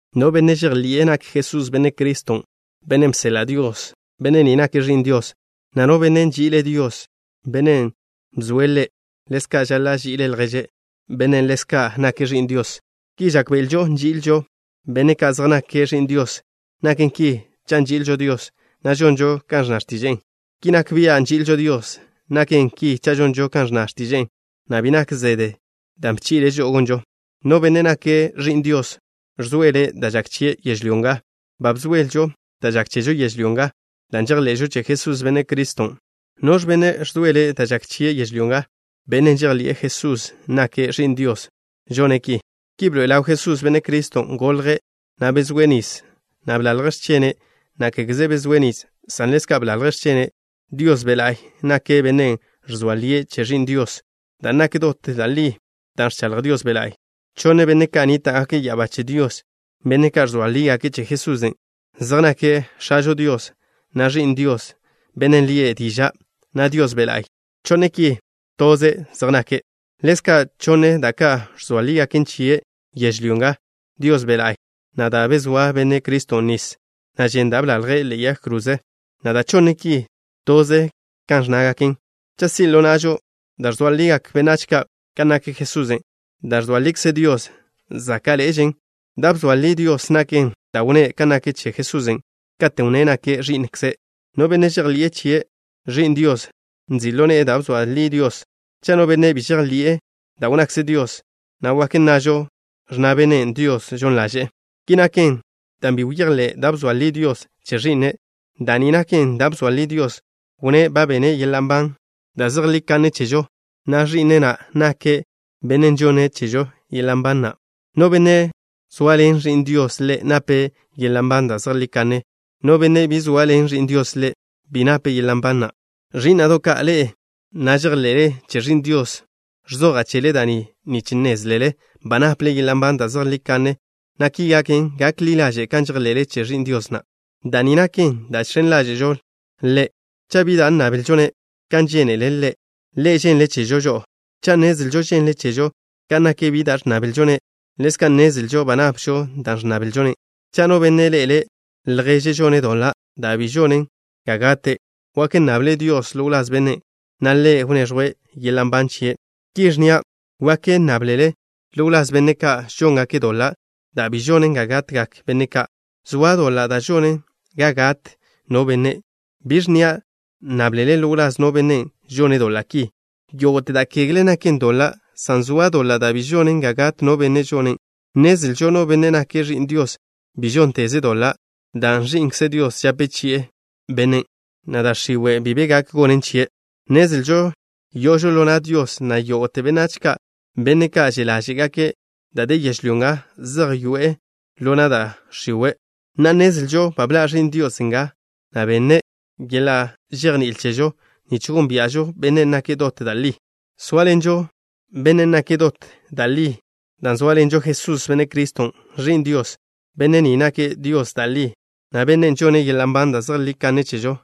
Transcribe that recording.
No benne' žejḻi'e nak Jesús Benne' Criston', Bennen' bseḻa' Dios, benne' ni nake' ẕi'n Dios, na' no benne' nži'ile' Dios, Bennen' bzoe' ḻe', ḻezka' žaḻa' ži'ile' lježe', bennen' ḻezka' nake' ẕi'n Dios. Ki žákbe'elžo nži'ilžo benne' ka' zej nake' ẕi'n Dios. Naken ki cha' nži'ilžo Dios, na' žonžo kan ẕnna x̱tiže'e. Ki nak bia' nži'ilžo Dios. Naken ki cha' žonžo kan ẕnna x̱tiže'e, na' bi nak zede dan' bchi'le' žo'o gonžo. No benne' nake' ẕi'n Dios ẕzoele' da' žak chie' yežlyó nga. Ba bzoelžo da' žak chežo yežlyó nga dan' žejḻe'žo che Jesús, Benne' Criston'. ¿Noẕ bennen' ẕzoele' da' žak chie' yežlyó nga? Bennen' žejḻi'e Jesusen' nake' Ẕi'n Dios žone' ki. Ki bḻoe'e ḻaw Jesús, Benne' Criston'. Golje', na' bezóe' nis, na' blalje' x̱chene', na' kégeze bezóe' nis, san ḻezka' blalje' x̱chene'. Dios Be' La'y nake' Bennen' ẕzoa lie' che Ẕi'n Dios, dan' nak dot da' li da' ẕchaḻj Dios Be' La'y. Chonne benne' ka' nníta'gake' ya'abá che Dios, benne' ka' ẕzoa lígake' che Jesusen'. Zej nake' X̱ažo Dios, na' Ẕi'n Dios, Bennen' lie' Diža', na' Dios Be' La'y. Chonne' ki, toze zej nake'. Ḻezka', chonne da' ka' ẕzoa lígaken chie' yežlyó nga, Dios Be' La'y, na' da' bezóa Benne' Criston' nis, na' žen da' blalje' ḻe'e yag kroze, na' da' chonne ki, toze kan ẕnnágaken. Cha' si' ḻo na'žo da' ẕzoa ligak benách ka' kan nak Jesusen', da' ẕzoa likze Dios záka'ḻe'ežen. Da' bzoa li Dios naken da' wnné' kan nak che Jesusen', katen' wnné' nake' Ẕi'nkze'. No benne' žejḻi'e che Ẕi'n Dios, nzi' ḻo ne'e da' bzoa li Dios. Cha' no benne' bi žejḻi'e da' wnnakze Dios, na' wak nnažo: ẕnna bennen': “Dios žon ḻaže'e.” Ki naken dan' bi bejḻi'e da' bzoa li Dios che Ẕi'ne'. Da' ni naken da' bzoa li Dios. Wnné' ba benne' yeḻa' nban da' zejlí kanne chežo, na' Ẕi'ne' na' nake' Benne' žonne' chežo yeḻa' nban na'. No benne' zoaḻen Ẕi'n Dios ḻe', nape' yeḻa' nban da' zejlí kanne. No benne' bi zoaḻen Ẕi'n Dios ḻe', bi nape' yeḻa' nban na'. Ẕí'na'do' ka', ḻe'e na' žejḻe'le che Ẕi'n Dios, ẕzoja' chele da' ni nich nnézlele ba naple yeḻa' nban da' zejlí kanne, na' ki gaken, gak ḻi ḻaže' kan žejḻe'le che Ẕi'n Dios na'. Da' ni naken da' žx̱en ḻáže'žo Ḻe'. Cha' bi da' nnablžo-ne' kan žénele' Ḻe', Ḻe' ženle' chežo žo'o. Cha' nnezlžo ženle' chežo kan nak bi da' ẕnnablžo-ne', ḻezka' nnezlžo ba napžo da' ẕnnablžo-ne'. Cha' no benne' ḻe'ele' lježe' žone' doḻa' da' bi žonen ga gate', wak nnable' Dios ḻo wláz bennen', na' Ḻe' wneẕjwe' yeḻa' nban chie'. Ki ẕnnia': wak nnáblele ḻo wláz benne' ka' žóngake' doḻa' da' bi žonen ga gatgak benne' ka'. Zoa doḻa' da' žonen ga gat no benne'. Bi ẕnnia' nnáblele ḻo wláz no benne' žone' doḻa' ki. Yógo'te da' kegle naken doḻa', san zoa doḻa' da' bi žonen ga gat no benne' žonen'. Nnezlžo no benne' nake' ẕi'n Dios bi žónteze' doḻa' dan' Ẕi'nkze Dios žape chi'e bennen', na' da' x̱iwe' bi be gak gonen chie'. Nnezlžo yo'ožo ḻo na' Dios, na' yógo'te benách ka', benne' ka' že' ḻáže'gake' da' de yežlyó nga, zej yoe'e ḻo na' da' x̱iwe'. Na'a, nnezlžo ba bḻa' Ẕi'n Dios nga, na' benne' yeḻa' žejní'il chežo, nich gónbia'žo Bennen' nake' dot da' li. Zóaḻenžo Bennen' nake' dot da' li dan' zóaḻenžo Jesús, Benne' Criston', Ẕi'n Dios. Benne' ni nake' Dios da' li, na' Bennen' žonne' yeḻa' nban da' zejlí kanne chežo.